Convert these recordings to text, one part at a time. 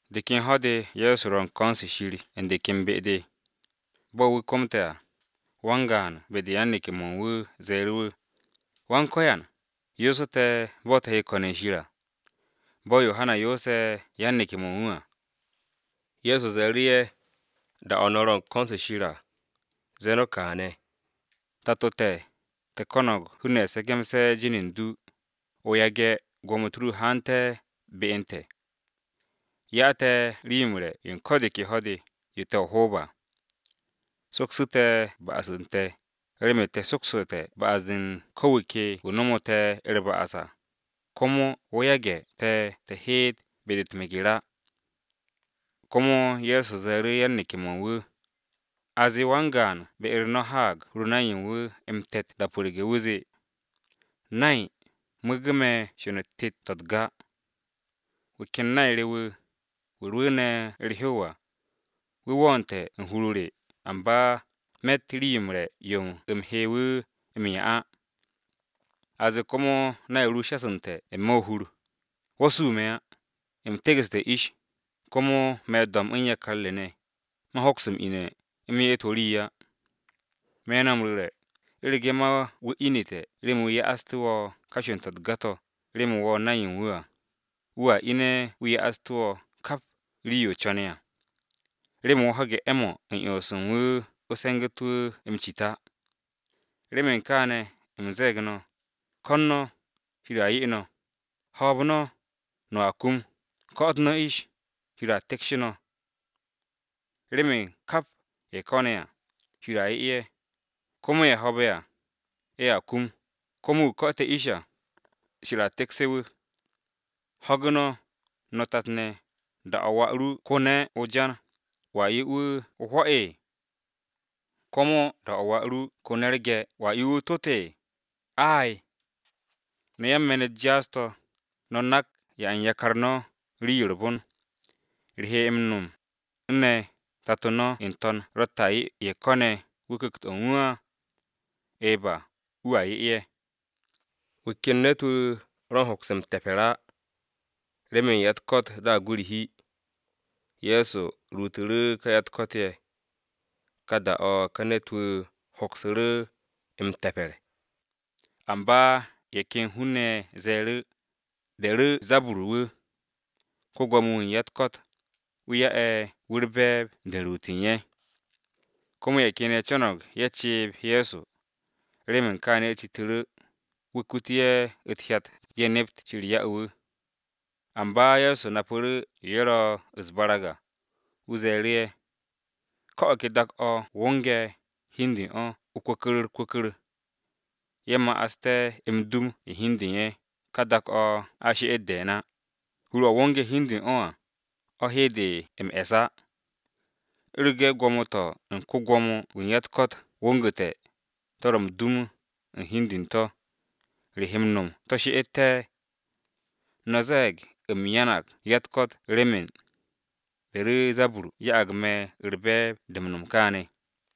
De ken ho̱-de Ye̱so ro̱ u̱n ko̱n-se u̱n Shir u̱n de ken be-de. Bo̱ wu̱ komte̱ à, wan-gaan be-de u̱n yan-neke̱-mo̱ u̱n wu̱ ze̱e̱ru̱ wu̱, “Go̱s-wu̱, yoosu̱ te̱ bo̱ te̱ he ko̱n u̱n Shir à, bo̱ Yohana yoose̱ yan-neke̱-mo̱ u̱n wu̱ à.” Ye̱so ze̱e̱ru̱ ye̱, “Da-o̱ no̱ ro̱ u̱n ko̱n-se u̱n Shir à, ze̱e̱ no̱ kaane̱: “ ‘Tato te̱, te̱ ko̱no̱g hun-ne̱ se̱ke̱mse̱ jin u̱n du. O yage̱ gwo̱mo-u̱t ru haante̱ be u̱n te̱. Ya te̱ rii-yo m-re̱ yo u̱n ko̱ de ke ho̱-de, yo te̱ o-hoob à. Soksu̱ te̱ ba'as u̱n te̱, remen te̱ sokstè̱ ba'as-de u̱n ko̱ wu̱ ke wu̱ nomu̱ te̱ u̱r-ba'as à. Komo wo̱ yage̱ te̱ te̱ heet be-de u̱t-meger á.’” Komo Ye̱so ze̱e̱ru̱ yan-neke̱-mo̱ u̱n wu̱, “A zee wan-gaan be-u̱r no̱ haag hur-o nay u̱n wu̱ m-te̱t da-o pu̱rge̱, wu̱ zee, ‘Nay, mu̱u̱gu̱ me̱ sho̱n-u̱t tet-to̱ u̱t-ga. Wu̱ ken nay re wu̱, wu̱ rwu̱u̱ne̱ u̱r-hew à, wu̱ wo̱o̱nte̱ u̱n hur-o re, amba me̱tt rii-yo m-re̱ yo u̱m he wu̱ m-'ya á!’ A zee komo nay ru shasu̱nte̱ n-me̱ o-hur, ‘Wo̱ su me̱ á! U̱m tegu̱ssu̱te̱ ish, komo me̱ do̱mb u̱n yakar re ne̱. Man hoks m-ine̱ u̱m ye'et wo̱ rii á.’ Me̱ no̱ m-ru̱re̱, u̱rege̱ ma wu̱ ine̱ remen wu̱ ya'aste̱ wo̱ ka sho̱n-to̱ u̱t-ga to̱ remen wo̱ nay u̱n wu̱ á, wu̱a ine̱ wu̱ ya'aste̱ wo̱ kap rii-yo o co̱ne̱ à, remen wo̱ ho̱ge̱ 'e̱-mo̱ u̱n 'yons u̱n wu̱ o se̱ngu̱te̱ wu̱ m-cit á. “Remen kaane̱ u̱m ze̱e̱g no̱: Ko̱n no̱, Shir a 'ye no̱, hoob no̱, no̱a kum, ko̱'o̱t no̱ ish, Shir a tikshe̱ no̱. Remen kap ye̱ ko̱ne̱ à, Shir a 'ye ye̱, komo ye̱ ho̱o̱be̱ à, ye̱a kum, komo wu̱ ko̱'o̱te̱ ish à, Shir a tikshe̱ wu̱. Ho̱gu̱ no̱, no̱ tat-ne̱, da-o̱ wà ru ko̱ne̱ o-jan, ¿wo̱a 'ye wu̱ o-hwo̱? Komo da-o̱ wà ru ko̱ne̱ u̱r-ge̱, ¿wo̱a 'ye wu̱ o-tot? Ay! No̱ yan-me̱n-u̱t jaas-to̱, no̱ nak 'ya u̱n yakar no̱ rii-yo u̱r-bon. ¿Re he m-no̱m u̱n ne̱, tato no̱ n-to̱n ro̱tte̱ a 'ye ye̱ ko̱ne̱ wu̱ Ku̱kt-o u̱n wu̱ á? Eba, wu̱a 'ye ye̱!” Wu̱ ken ne̱t-wu̱ ro m-hoks m-te̱pe̱r á, remen ya-u̱t-ko̱t daag wu̱ u̱r-hi. Ye̱so ruutu̱ru̱ ka ya-u̱t-ko̱t ye̱, ka da-o̱ ka ne̱t-wu̱ hoksu̱ru̱ m-te̱pe̱r. Amba ye̱ ken hun-ne̱ ye̱ ze̱e̱ru̱, “Beru̱zabur wu̱, ko-Gwo̱mo-wu̱ u̱n ya-u̱t-ko̱t, wu̱ ya'e̱ wu̱ u̱r-be̱e̱b de u̱n ruut u̱n ye̱.” Komo ye̱ ken ye̱ co̱no̱g ye̱ ceeb Ye̱so. Remen kaane̱ ye̱ citu̱ru̱, wu̱ kute̱ ye̱ u̱t-hyat ye̱ nept Shir ya'e̱ wu̱. Amba Ye̱so napu̱ru̱ yo ye̱ ro̱ u̱s-barag à, wu̱ ze̱e̱ru̱ ye̱, “Ko̱ o̱ ke dak-o̱ wo̱nge̱ hi u̱n de u̱n o̱ kwu̱ku̱r u̱r-kwu̱ku̱r ye̱ ma'aste̱ m-dum u̱n hi u̱n de u̱n ye̱ ka dak-o̱ a she'et de̱e̱n á. Hur-o̱ wo̱nge̱ hi u̱n de u̱n o̱ à, o̱ he de m-e̱s á. U̱rege̱ gwo̱mo-to̱ u̱n ko-Gwo̱mo-wu̱ u̱n ya-u̱t-ko̱t wo̱ngu̱te̱, to̱ ro̱ m-dum u̱n hi u̱n de u̱n to̱, ¿re he m-no̱m to̱ she'ette̱? No̱ ze̱e̱g u̱m ruute̱ ya-u̱t-ko̱t remen Beru̱zabur ya'ag me̱ u̱r-be̱e̱b de m-no̱m kaane̱.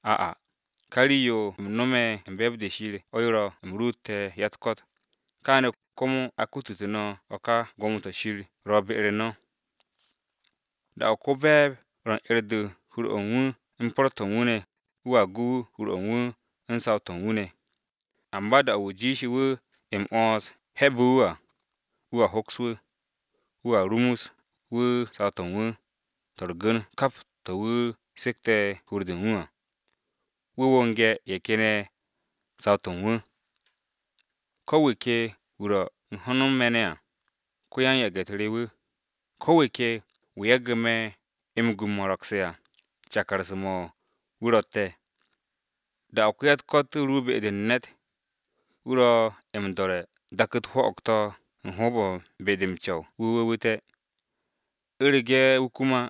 Ai ka rii-yo u̱m nome̱ u̱n be̱e̱b-de Shir o̱ rwo̱'e̱ u̱m ruute̱ ya-u̱t-ko̱t, kaane̱, komo a kutute̱ no̱ o̱ ka gwo̱mo-to̱ Shir ro̱ be-u̱r no̱. “Da-o̱ ko-be̱e̱b ro u̱n 'er-de u̱n hur-o̱ u̱n wu̱ u̱n po̱r-to̱ u̱n wu̱ ne̱, wu̱a gu hur-o̱ u̱n wu̱ u̱n saw-to̱ u̱n wu̱ ne̱. Amba da-o̱ wu̱ jiishe̱ wu̱ m-'wo̱ns he̱be̱ wu̱ à, wu̱a hoks wu̱, wu̱a rumus wu̱ saw-to̱ u̱n wu̱ to̱ u̱r-gu̱n kap to̱ wu̱ sekte̱ hur-de u̱n wu̱ à. Wu̱ wo̱nge̱ ye̱ ken ye̱ saw-to̱ u̱n wu̱. “Ko̱ wu̱ ke wu̱ ro̱ u̱n ho̱n u̱n me̱ ne̱ à, ko-yan-yage̱-u̱t re wu̱, ko̱ wu̱ ke wu̱ yage̱ me̱ m-gu m-mo̱ro̱gse̱ à, cakarse̱-mo̱ wu̱ ro̱tte̱. “Da-o̱ wa-u̱t-ko̱t ru be-de u̱n ne̱t, wu̱ ro̱ m-do̱re̱ u̱n dak-u̱t 'hwo̱'o̱g-to̱ u̱n hoob-o̱ u̱n be-de m-co̱w wu̱ wu̱wu̱te̱. U̱rege̱ wu̱ kum á,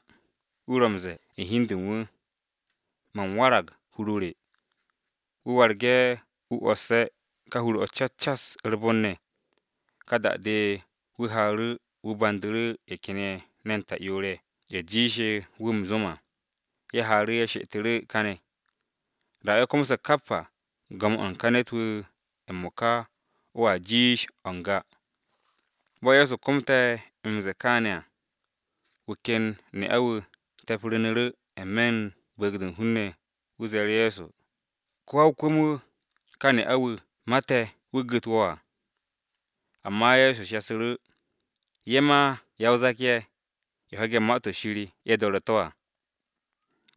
wu̱ ro̱ m-ze̱e̱ u̱n hi u̱n de u̱n wu̱, ‘Man warag u̱n hur-o re.’ Wu̱ warge̱ wu̱ 'wosse̱ ka hur-o̱ cas cas u̱r-bon ne̱. Ka da-de wu̱ haaru̱ wu̱ bandu̱ru̱ ye̱ ken ye̱ ne̱n ta'yoor-ye̱ jiishe̱ wu̱ m-zo̱m à, ye̱ haaru̱ ye̱ she'etu̱ru̱ kane̱. Da-o̱ ye̱ komse̱ kap à, go̱m-o̱ u̱n ka ne̱t-wu̱ m-mo̱ka o̱a jiish o̱ n-ga.” Bo̱ Ye̱so komte̱ m-ze̱e̱ kaane̱ à, wu̱ ken ne'a-wu̱ te̱pru̱nu̱ru̱ n-me̱ u̱n bu̱u̱g-de u̱n hun-ne̱, wu̱ ze̱e̱ru̱ Ye̱so, “Ko-wa-o-kwu̱m-wu̱, ka ne'a-wu̱ mate̱ wu̱ gu̱t wo̱ à.” Amba Ye̱so shasu̱ru̱, “Ye̱ ma ya-o-zak-ye̱, ye̱ ho̱ge̱ Ma-to̱ Shir ye̱ do̱re̱ to̱ à!”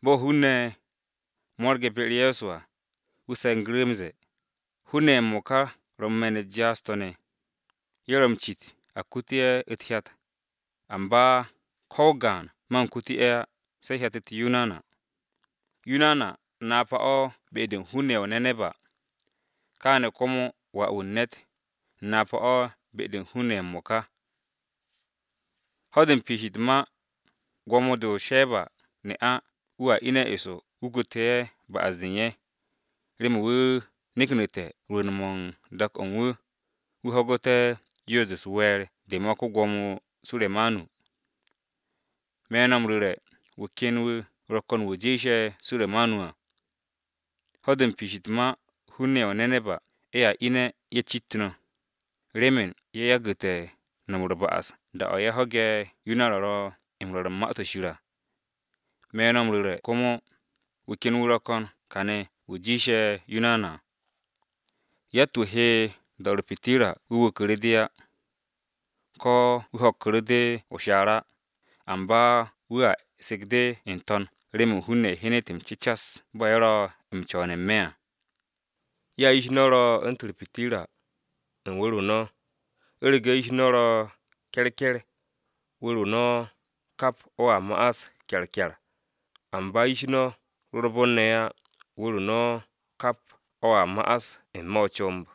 Bo̱ hun-ne̱ mo̱rge̱ be-u̱r Ye̱so à, wu̱ se̱ngu̱ru̱ m-ze̱e̱, “Hun-ne̱ ye̱ m-mo̱ka ro̱ u̱n me̱n-u̱t jaas-to̱ ne̱! Ye̱ ro̱ m-cit a kute̱ ye̱ u̱t-hyat, amba ko̱ o-gaan man kute̱ ye̱ á se hyat-u̱t Yunana. Yunana napa-o̱ be-de u̱n hun-ne̱ ye̱ o-Neneba, kaane̱ komo Wà-wu̱ u̱n ne̱t napa-o̱ be-de u̱n hun-ne̱ ye̱ m-mo̱ka. Ho̱-de m-piish u̱t-ma, gwo̱mo-de o-Sheba [ne'a] wu̱a ine̱ eso wu̱ kute̱ ye̱ ba'as-de u̱n ye̱, remen wu̱ neknu̱te̱ rwu̱u̱n-mo̱ u̱n dak-o̱ u̱n wu̱, wu̱ ho̱gu̱te̱ yoos-de u̱s-we̱e̱r de ma ko-Gwo̱mo Suremanu. Me̱ no̱ m-ru̱re̱, wu̱ ken wu̱ ro̱ ko̱n wu̱ jiishe̱ Suremanu à. Ho̱-de u̱n piish u̱t-ma hun-ne̱ ye̱ o-Neneba ye̱a ine̱ ye̱ cit no̱, remen ye̱ yagu̱te̱ no̱m u̱r-ba'as da-o̱ ye̱ ho̱ge̱ Yunana ro̱ m-rwo̱r u̱n Ma-to̱ Shir à, me̱ no̱ m-ru̱re̱ komo, wu̱ ken wu̱ ro̱ ko̱n kane̱ wu̱ jiishe̱ Yunana à! “Yatt-wu̱ he do̱ u̱r-pitirra wu̱ wuku̱ru̱ de á, ko̱ wu̱ ho̱kku̱ru̱ de o-shaar á, amba wu̱a sek de n-to̱n remen hun-ne̱ hyenet m-cecas bo̱ ye̱ ro̱ m-co̱wo̱n n-me̱ à. Ya yish no̱ ro̱ u̱ntu̱n u̱r-pitirra, u̱n wu̱r-o no̱. U̱rege̱ yish no̱ ro̱ ke̱rke̱r, wu̱r-o no̱ kap o̱a no̱m kyarkyar, amba yish no̱ ro u̱r-bon ne̱ á, wu̱r-o no̱ kap o̱a ma'as n-me̱ o-comb.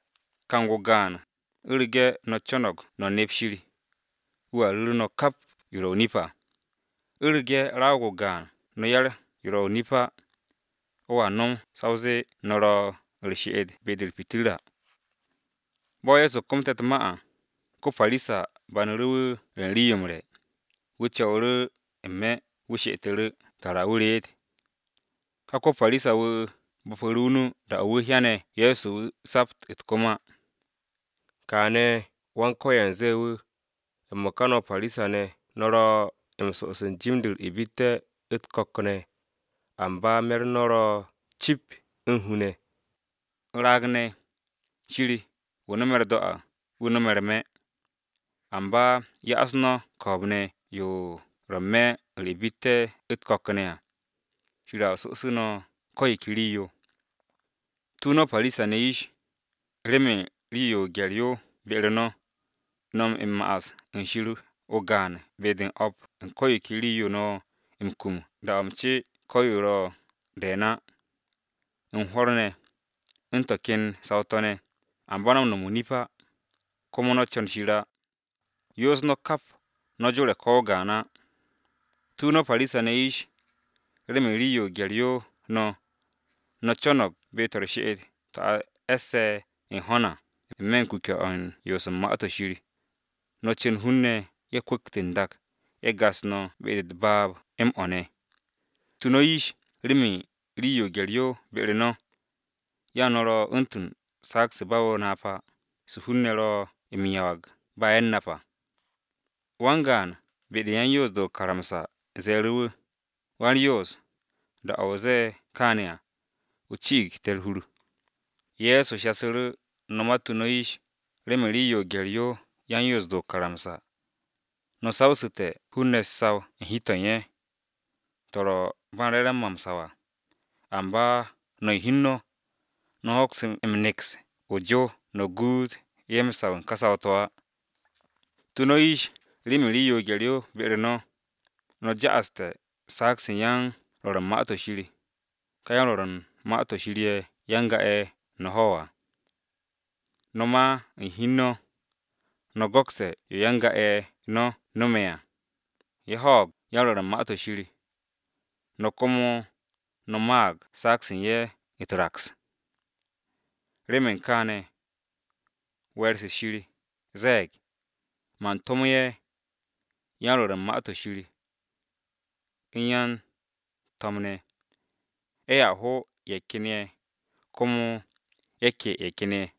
Kang-o̱ o-gaan, u̱rege̱ no̱ co̱no̱g no̱ nep Shir, wu̱a ru̱ru̱ no̱ kap yo ro̱ o-nip à. U̱rege̱ ko̱ raag-o gaan no̱ 'yar yo ro̱ o-nip á, o̱a no̱m sa o zee no̱ ro̱ u̱r-she'et be-de u̱r-pitirra.” Bo̱ Ye̱so komte̱ u̱t-ma à, ko-Parisa banu̱ru̱ wu̱ re̱ u̱n rii-yo m-re̱. Wu̱ co̱wu̱ru̱ n-me̱ wu̱ she'etu̱ru̱ tara wu̱ reet. Ka ko-Parisa-wu̱ bo̱pu̱ru̱ o-nu da-o̱ wu̱ hyane̱ Ye̱so wu̱ sapt u̱t-kom á. Kaane̱ Go̱s-wu̱ ze̱e̱ wu̱, “M-mo̱ka no̱ Parisa-ne̱ no̱ ro̱ m-so'os jim-de u̱r-ibitte̱ u̱t-ko̱k ne̱, amba me̱-u̱r no̱ ro̱ cip u̱n hu ne̱. Raag-ne̱! Shir, wu̱ no̱me̱ u̱r-do̱ à, wu̱ no̱me̱ u̱r-me̱! Amba ya'as no̱ ko̱o̱b-ne̱ yo ro̱ n-me̱ u̱r-ibitte̱ u̱t-ko̱k ne̱ à, Shir a so'osu̱ no̱ ko̱ yo ke rii-yo. “Tu no̱ yish Parisa-ne̱, remen rii-yo o-gye̱r yo be-u̱r no̱, no̱ m-ya'as u̱n Shir o-gaan be-de u̱n o̱p u̱n ko̱ yo ke rii-yo no̱ m-kum da-o̱ m-ce ko̱ yo ro̱ de̱e̱n á. U̱n hwo̱r ne̱, u̱n to̱ ken saw-to̱ ne̱, amba no̱ m-no̱m o-nip á, komo no̱ co̱n Shir á. Yoos no̱ kap, no̱ jore̱ ko̱ o-gaan á. “Tu no̱ yish Parisa-ne̱, remen rii-yo gye̱r-yo no̱, no̱ co̱no̱g be-to̱ u̱r-she'et to̱ a e̱sse̱ u̱n ho̱n à, n-me̱ u̱n kuke̱-to̱ u̱n yoos u̱n Ma-to̱ Shir, no̱ cu̱n hun-ne̱ ye̱ kwu̱kt n-dak ye̱ gas no̱ be-de u̱t-baab m-o̱ ne̱. Tu no̱ yish remen rii-yo gye̱r-yo be-u̱r no̱! Ya no̱ ro̱ u̱ntu̱n saag-se ba o-napa, se hun-ne̱ ro̱ m-yawag ba ye̱ u̱n nap á.” Wan-gaan be-de u̱n yan-Napse̱ o-karamsa ze̱e̱ru̱ wu̱, “Wa-u̱r-Yoos, da-o̱ o ze̱e̱ kaane̱ à, o ci'ig te̱ u̱r-hur!” Ye̱so shasu̱ru̱, “No̱ ma tu no̱ yish remen rii-yo gye̱r-yo yan-Napse̱ o-karamsa! No̱ sawsu̱te̱ hun-ne̱ u̱t-saw u̱n hi-to̱ u̱n ye̱, to̱ ro̱ ba m-re̱re̱m mo̱ m-saw á, amba no̱ u̱n hi u̱n no̱, no̱ hoks m-neks o-jow no̱ guut ye̱ m-saw u̱n ka saw-to̱ á. Tu no̱ yish remen rii-yo gye̱r-yo be-u̱r no̱, no̱ ja'aste̱ saag-se u̱n yan-rwo̱r u̱n Ma-to̱ Shir, ka yan-rwo̱r u̱n Ma-to̱ Shir ye̱ ya-n-ga-ye̱ no̱ ho̱ à. No̱ ma u̱n hi u̱n no̱, no̱ go̱kste̱ yo ya-n-ga-ye̱ no̱ ne̱ no̱me̱ à, ye̱ ho̱o̱g yan-rwo̱r u̱n Ma-to̱ Shir, no̱ komo no̱ maag saag-se u̱n ye̱ u̱t-raks. Remen kaane̱, we̱e̱r-se Shir ze̱e̱g, ‘Man tomo̱ ye̱ yan-rwo̱r u̱n Ma-to̱ Shir u̱n yan-to̱m ne̱, ye̱a ho ye̱ ken ye̱, komo ye̱ ke ye̱ ken ye̱.’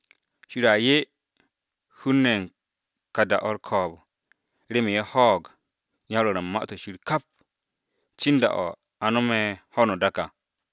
Shir a 'ye hun-ne̱ ye̱ u̱n ka da-o̱ u̱r-ko̱o̱b remen ye̱ ho̱o̱g yan-rwo̱r u̱n Ma-to̱ Shir kap, cin da-o̱ a no̱me̱ ho̱no o-dak à.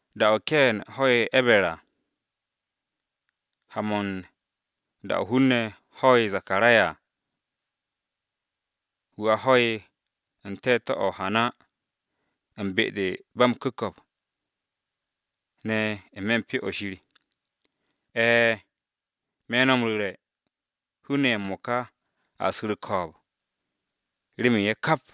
Da-o̱ Keen ho̱'e̱ E̱ber à ha-mo̱ u̱n, da-o̱ hun-ne̱ ho'e̱ Zakaraya, (wu̱ a ho̱'e̱ u̱n te̱te̱-o̱ o-hana u̱n be-de ba m-ku̱ko̱p ne̱ n-me̱ u̱n Pyo-o̱ Shir). E̱e̱, me̱ no̱ m-ru̱re̱, hun-ne̱ ye̱ m-mo̱ka a su̱ u̱r-ko̱o̱b remen ye̱ kap!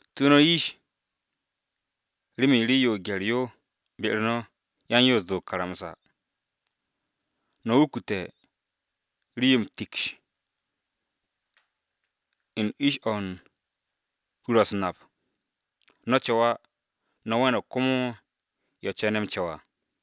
“Tu no̱ yish remen rii-yo gye̱r-yo be-u̱r no̱ yan-Napse̱ o-karamsa! No̱ wukute̱ rii-yo m-tiksh u̱n ish-o̱ u̱n hur-o̱ u̱s-nap. No̱ co̱w á, no̱ we̱ne̱g komo ye̱ co̱ne̱ m-co̱w à.”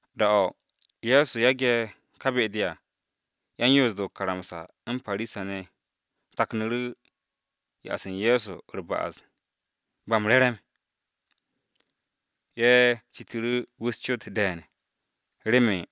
Da-o̱ Ye̱so yage̱ ka be-de à, yan-Yoos-de o-karamsa u̱n Parisa-ne̱ taknu̱ru̱ ya'as u̱n Ye̱so u̱r-ba'as ba m-re̱re̱m. Ye̱ citu̱ru̱ wu̱ u̱s-cot de̱e̱n remen